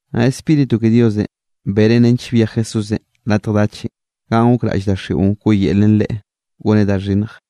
Naꞌ Spíritu ke Diosenꞌ benen nench byej Jesúsenꞌ latj dachenꞌ ganꞌ gokraꞌll daxiꞌon wkoꞌyelen Leꞌe goneꞌ da xhinnj.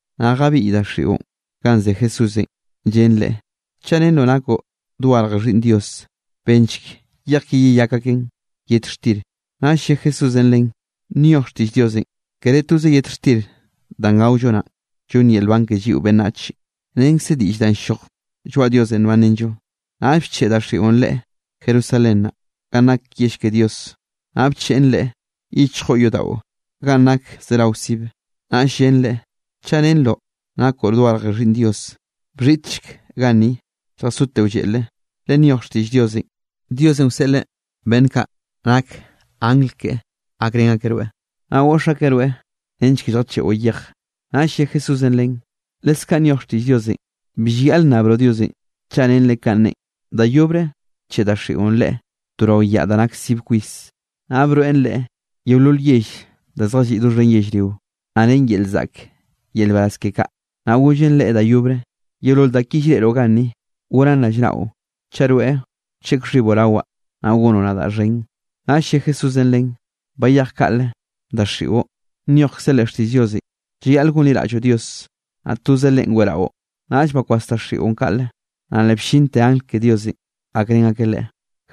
Naꞌ jabiꞌy daxiꞌon ganꞌ ze Jesúsenꞌ, llen Leꞌe: —Chaꞌ rennroꞌ nakoꞌ dogarje Xhiꞌnn Dios, benchk yej ki yeyak aken yet xtir. Naꞌll lle Jesúsenꞌ len: —Nyoj xtiꞌll Diosenꞌ: “Kere toze yet xtir danꞌ gaollo naꞌ, llonn yel nban ke lliꞌo beꞌnnach, renkze diꞌll danꞌ ll-lloj lloaꞌ Diosenꞌ nbanrenllo.” Naꞌll bcheꞌe daxiꞌon Leꞌe Jerusalén naꞌ, ganꞌ nak yell ke Dios. Naꞌ bcheꞌn Leꞌe yichjo yodaꞌo ganꞌ nak zeraoze sibe, naꞌll llen Leꞌe: —Chaꞌ rennroꞌ nakoꞌ dogarje Xhiꞌnn Dios, bxhiꞌtchek ganni, lljasoteꞌo lleꞌle, le nyoj xtiꞌll Diosenꞌ: Diosenꞌ wseꞌleꞌ beꞌnn kaꞌ nak angl keꞌe gakrén akeꞌ rweꞌ, naꞌ goꞌx akeꞌ rweꞌ nench ke lljacheꞌo yej. Naꞌll lle Jesúsenꞌ len: —Leskaꞌ nyoj xtiꞌll Diosenꞌ: “Bi llayaꞌl nnabroꞌ Diosenꞌ chaꞌ rennreꞌ kanꞌ neꞌen.” Da yobre bcheꞌe daxiꞌon Leꞌe to rao yaꞌ da nak sib kwis, naꞌ broeꞌn Leꞌe yeolol yell da zjalliꞌ doxhen yellrio, naꞌ ren yel zaꞌk yel nbaraz ke kaꞌ. Naꞌ gollen Leꞌe da yobre: —Yeolol da ki llreꞌroꞌ ganni, gonaꞌn rallnaꞌo chaꞌ rweꞌ wcheꞌk xhiboꞌ rawaꞌ, naꞌ gonoꞌ nadaꞌ xhen. Naꞌll lle Jesúsenꞌ len: —Bayej kaꞌle, daxiꞌo, nyojkze leꞌ xtiꞌll Diosenꞌ: “Llayaꞌl gonliraꞌlloꞌ Dios, naꞌ toze Leꞌen weꞌraꞌo.” Naꞌll bakwas daxiꞌon kaꞌle, naꞌ le bllinte angl ke Diosenꞌ jakrén akeꞌ Leꞌe.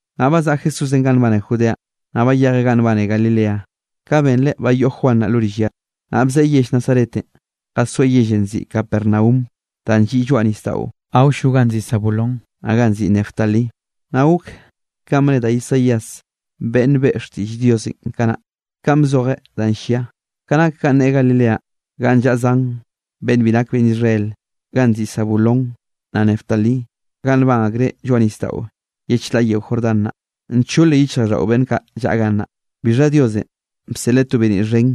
Naꞌ bazaꞌa Jesúsenꞌ ganꞌ nbane Judeanꞌ, naꞌ bayejeꞌ ganꞌ nbane Galilea, ka benreꞌ ba yoꞌ Juan naꞌ lo rill ya. Naꞌ bzeꞌe yell Nazaretenꞌ, jasoeꞌ yellenꞌ nziꞌi Capernaum, danꞌ lliꞌ lloaꞌ nisdaꞌon awllo ganꞌ nziꞌi Zabulón, naꞌ ganꞌ nziꞌi Neftalí. Naꞌ gok kanꞌ bne da Isaías beꞌnn beꞌe xtiꞌll Diosenꞌ kanaꞌ, ka bzojeꞌ danꞌ llia: Ka nak ganꞌ ne Galileanꞌ ganꞌ llaꞌa zan beꞌnn bi nak beꞌnn Israel, ganꞌ nziꞌi Zabulón, naꞌ Neftalí ganꞌ nban akreꞌ lloaꞌ nisdaꞌo ye chlaꞌ yeo Jordán naꞌ, nchole yichjraꞌlldaꞌo beꞌnn kaꞌ llaꞌa gannaꞌ. Bixha Diosenꞌ bseꞌleꞌ to beniꞌ xhen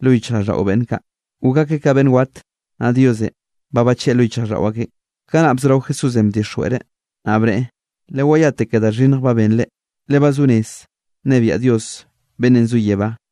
lo yichjraꞌlldaꞌo beꞌnn kaꞌ, gok akeꞌ ka beꞌnn wat, naꞌ Diosenꞌ ba bacheꞌe lo yichjraꞌlldaꞌo akeꞌn. Kanaꞌ bzorao Jesúsenꞌ bdixjweꞌreꞌ, naꞌ bneꞌe: —Lewayate ke da xhinnj ba benre, le ba zo rez nnebiaꞌ Dios beꞌnnenꞌ zo yebánꞌ.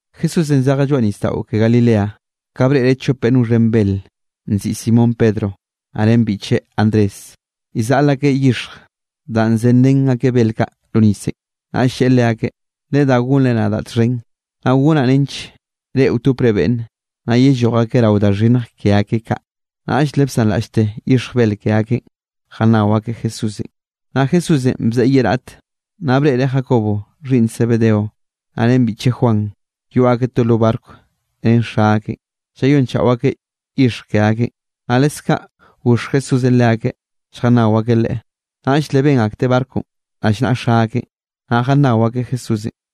Jesúsenꞌ zejeꞌ lloaꞌ nisdaꞌo ke Galilea, ka breꞌreꞌ chop beꞌnn wxhen bel nziꞌi Simón Pedro, naꞌ ren biꞌcheꞌ Andrés, llzaꞌl akeꞌ yixj danꞌ zenrén akeꞌ bel kaꞌ lo nisenꞌ. Naꞌll lleꞌe leakeꞌ: —Ledá gonre nadaꞌ txhen, naꞌ gonaꞌ nench reꞌ wtopre beꞌnne, naꞌ yelloj akeꞌ rao da xhinnj ke akeꞌ kaꞌ. Naꞌll le bsanraꞌllte yixj bel ke akeꞌn, jannao akeꞌ Jesúsenꞌ. Naꞌ Jesúsenꞌ bzeꞌe ye raꞌt, naꞌ breꞌreꞌ Jacobo xhiꞌnn Zebedeo, naꞌ ren biꞌcheꞌ Juan, yoꞌ akeꞌ to lo barco ren xa akeꞌn, llayonchaꞌo akeꞌ yixj ke akeꞌn. Naꞌ leskaꞌ goxh Jesúsenꞌ leakeꞌ, lljannao akeꞌ Leꞌe. Naꞌll le ben akteꞌ barconꞌ rallnaꞌa xa akeꞌn, naꞌ jannao akeꞌ Jesúsenꞌ.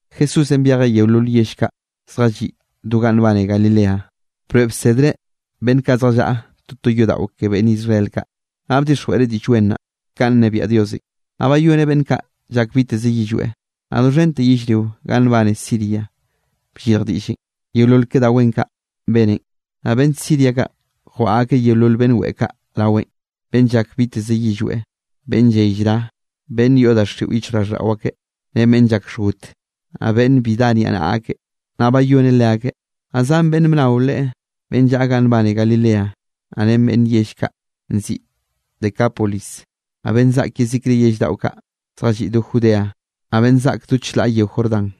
Jesúsenꞌ byejeꞌ yeolol yell kaꞌ zjalliꞌ do ganꞌ nbane Galilea, broeꞌ bsedreꞌ beꞌnn kaꞌ zjallaꞌa toto yodaꞌo ke beꞌnn Israel kaꞌ. Naꞌ bdixjweꞌreꞌ Diꞌll Wen naꞌ, kanꞌ nnebiaꞌ Diosenꞌ. Naꞌ bayoneꞌ beꞌnn kaꞌ llak biteze yillweꞌ. Naꞌ doxhente yellrio ganꞌ nbane Siria bllirj diꞌllenꞌ, yeolol ke da wen kaꞌ beneꞌn. Naꞌ beꞌnn Siria kaꞌ jwaꞌa akeꞌ yeolol beꞌnn weꞌe kaꞌ raweꞌn, beꞌnn llak biteze yillweꞌ, beꞌnn lley llra, beꞌnn yoꞌ daxiꞌo yichjraꞌlldaꞌo akeꞌ ren beꞌnn llak xhgot, naꞌ beꞌnn bi dá niaꞌnaꞌa ak, naꞌ bayoneꞌ leakeꞌ. Naꞌ zan beꞌnne bnao Leꞌe, beꞌnn llaꞌa ganꞌ nbane Galilea, naꞌ ren beꞌnn yell kaꞌ nziꞌi Decápolis, naꞌ beꞌnn zaꞌk Jerusalén, naꞌ beꞌnn zaꞌk yezikre yell daꞌo kaꞌ zjalliꞌ do Judea, naꞌ beꞌnn zaꞌk do chlaꞌ yeo Jordán.